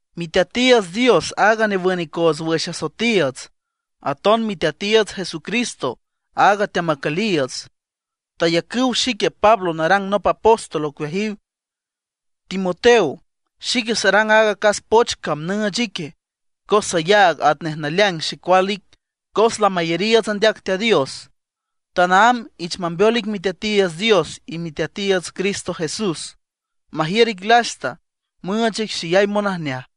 Miteatiiüts Dios aaga newün icoots wüx asoetiiüts, aton Miteatiiüts Jesucristo aaga teamacüliiüts, tayacüw xique Pablo narang nop apóstol ocueajiw. Timoteo, xique sarang aaga acas poch cam nüüch ique, cos sayaag atnej naleaing xecual ic cos lamayariiüts andeac Teat Dios. Tanaámb ich mambeol ic Miteatiiüts Dios y Miteatiiüts Cristo Jesús, majiür ic lasta, müüch ic xeyay monajneaj.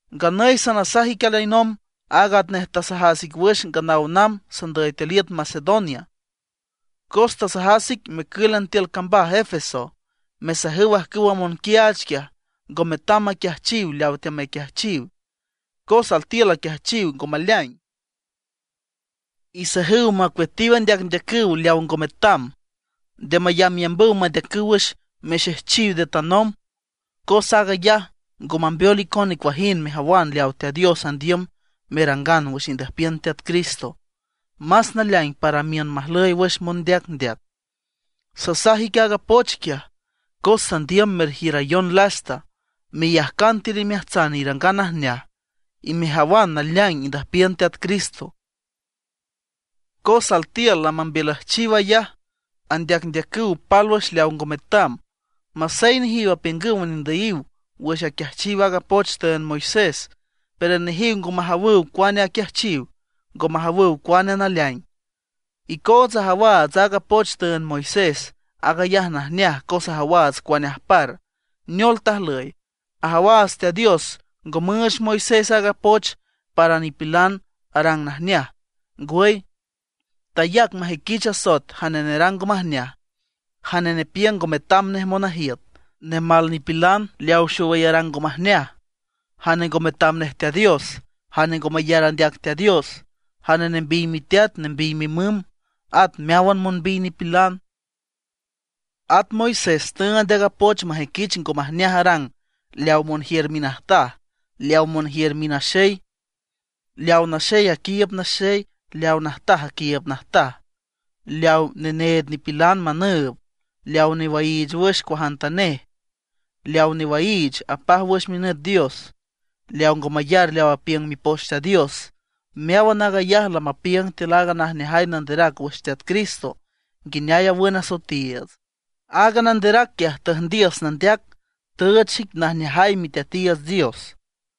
Nganüy sanasaj ic alinomb aag atnej tasajas ic wüx nganaw namb sandüy tiül iüt Macedonia. Cos tasajas ic mecǘlan tiül cambaj Efeso mesajüw ajcüwa monquiaach quiaj ngo metam maquiajchiw leawa teamaquiajchiw, cos altiül aquiajchiw ngo maleaing. Isajüw macueatiw andeacndeacüw leaw ngo metam; nde mayambyambüw mandeacüw wüx mixejchiw nde tanomb. Cos aag ayaj ngo mambeol icon nicuajind mejawan leaw Teat Dios andiüm merangan wüx indüjpiün Teat Cristo; más naleaing para miün majlüy wüx mondeacndeac. Sasaj ic aaga poch quiaj, cos sandiüm merjiürayon lasta, meyajcan tiül imeajtsan irangan najneaj, y mejawan naleaing indüjpiün Teat Cristo. Cos altiül lamambiülüjchiw ayaj, andeacndeacüw pálwüx leaw ngo metam. Masey nejiw apiüngüw nendüyiw wüx aquiajchiw aaga poch tüünd Moisés, pero nejiw ngo majawüw cuane aquiajchiw, ngo majawüw cuane naleaing. Icootsa ajawaats aaga poch tüünd Moisés, aag ayaj najneaj cos ajawaats cuane ajpar, neol tajlüy. Ajawaats Teat Dios ngo müüch Moisés aaga poch para nipilan arang najneaj. Ngwüy, tayac majüiquich asoet jane nerang ngo majneaj, jane nepiüng ngo metam nej monajiüt, nemal nipilan, leawa xowüy arang ngo majneaj, jane ngo metam nej Teat Dios, jane ngo mayar andeac Teat Dios, jane nembiy miteat nembiy mimüm, at meáwan monbiy nipilan. At Moisés tüünd aaga poch majüiquich ngo majneaj arang leaw monjiür minajtaj, leaw monjiür minaxey, leaw naxey aquiiüb naxey, leaw najtaj aquiiüb najtaj, leaw neneed nipilan manüüb, leaw newaiich wüx cuajantanej, leaw newaiich apaj wüx minüt dios, leaw ngo mayar leaw apiüng Mipoch Teat Dios. Meáwan aag ayaj lamapiüng tiül aaga najneajay nanderac wüx Teat Cristo, nguineay awün asoetiiüts. Aaga nanderac quiaj tüjndiüs nandeac, tüüch xic najneajay Miteatiiüts Dios.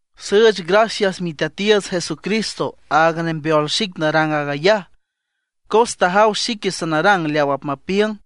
Süüch gracias Miteatiiüts Jesucristo, aaga nembeol xic narang aag ayaj, cos tajaw xique sanarang leaw apmapiüng.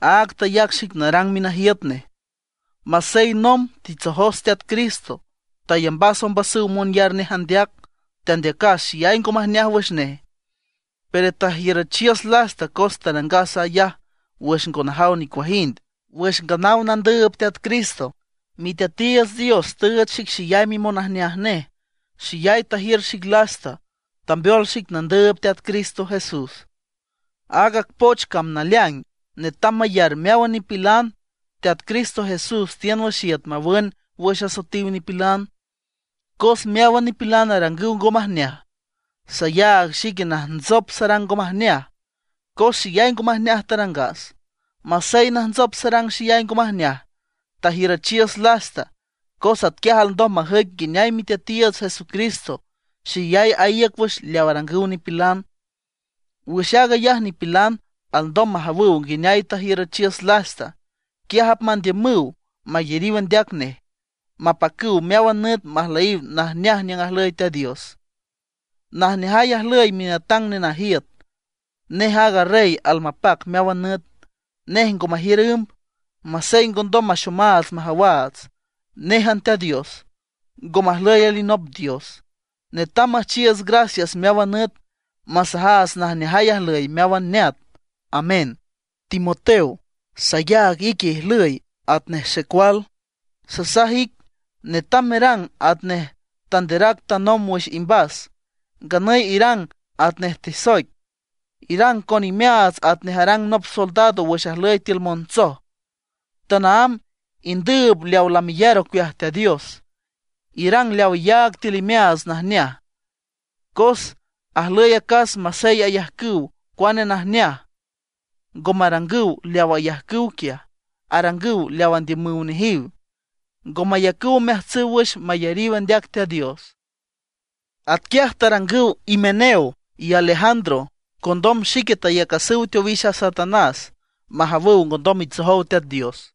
Áag tayac xic narang minajiüt nej. Masey nomb titsojos Teat Cristo, tayambas ombasüw monyar nej andeac, tandeacas xeyay ngo majneaj wüx nej. Pero tajiürüchiüs lasta cos tarangas ayaj wüx ngo najaw nicuajind, wüx nganaw nandüüb Teat Cristo. Miteatiiüts Dios tüüch xic xeyay mimonajneaj nej, xeyay tajiür xic lasta, tambeol xic nandüüb Teat Cristo Jesús. Aaga poch cam naleaing, netam mayar meáwan nipilan: Teat Cristo Jesús tiün wüx iüt mawün wüx asoetiw nipilan, cos meáwan nipilan arangüw ngo majneaj. Sayaag xique najntsop sarang ngo majneaj, cos xeyay ngo majneaj tarangas. Masey najntsop sarang xeyay ngo majneaj, tajiürüchiüs lasta cos atquiaj alndom majüic nguineay Miteatiiüts Jesucristo xeyay aíüc wüx leaw arangüw nipilan. Wüx aag ayaj nipilan alndom majawüw nguineay tajiürüchiüs lasta. Quiaj apmandiümüw mayariw andeac nej, mapacüw meáwan nüt majlüyiw najneaj niüng ajlüy Teat Dios. Najneajay ajlüy Minatang Nenajiüt, nej aaga Rey almapac meáwan nüt, nej ngo majiür ümb, masey ngondom maxomaats majawaats. Néjan Teat Dios, ngo majlüy alinop dios. Netam müjchiiüts gracias meáwan nüt, masajaats najneajay ajlüy meáwan neat, ¡Amén! Timoteo, sayaag ique ijlüy atnej xecual. Sasaj ic netam merang atnej tanderac tanomb wüx imbas. Nganüy irang atnej tesoic, irang con imeaats atnej arang nop soldado wüx ajlüy tiül montsoj. Tanaámb indüüb leawa lameyar ocueaj Teat Dios. Irang leaw iyaag tiül imeaats najneaj. Cos ajlüy acas masey ayajcüw cuane najneaj, ngo marangüw leaw ayajcüw quiaj, arangüw leaw andiümüw nejiw. Ngo mayacüw omeajtsüw wüx mayariw andeac Teat Dios. Atquiaj tarangüw Himeneo y Alejandro. Condom xique tayacasüw teowix a Satanás majawüw ngondom mitsojow Teat Dios.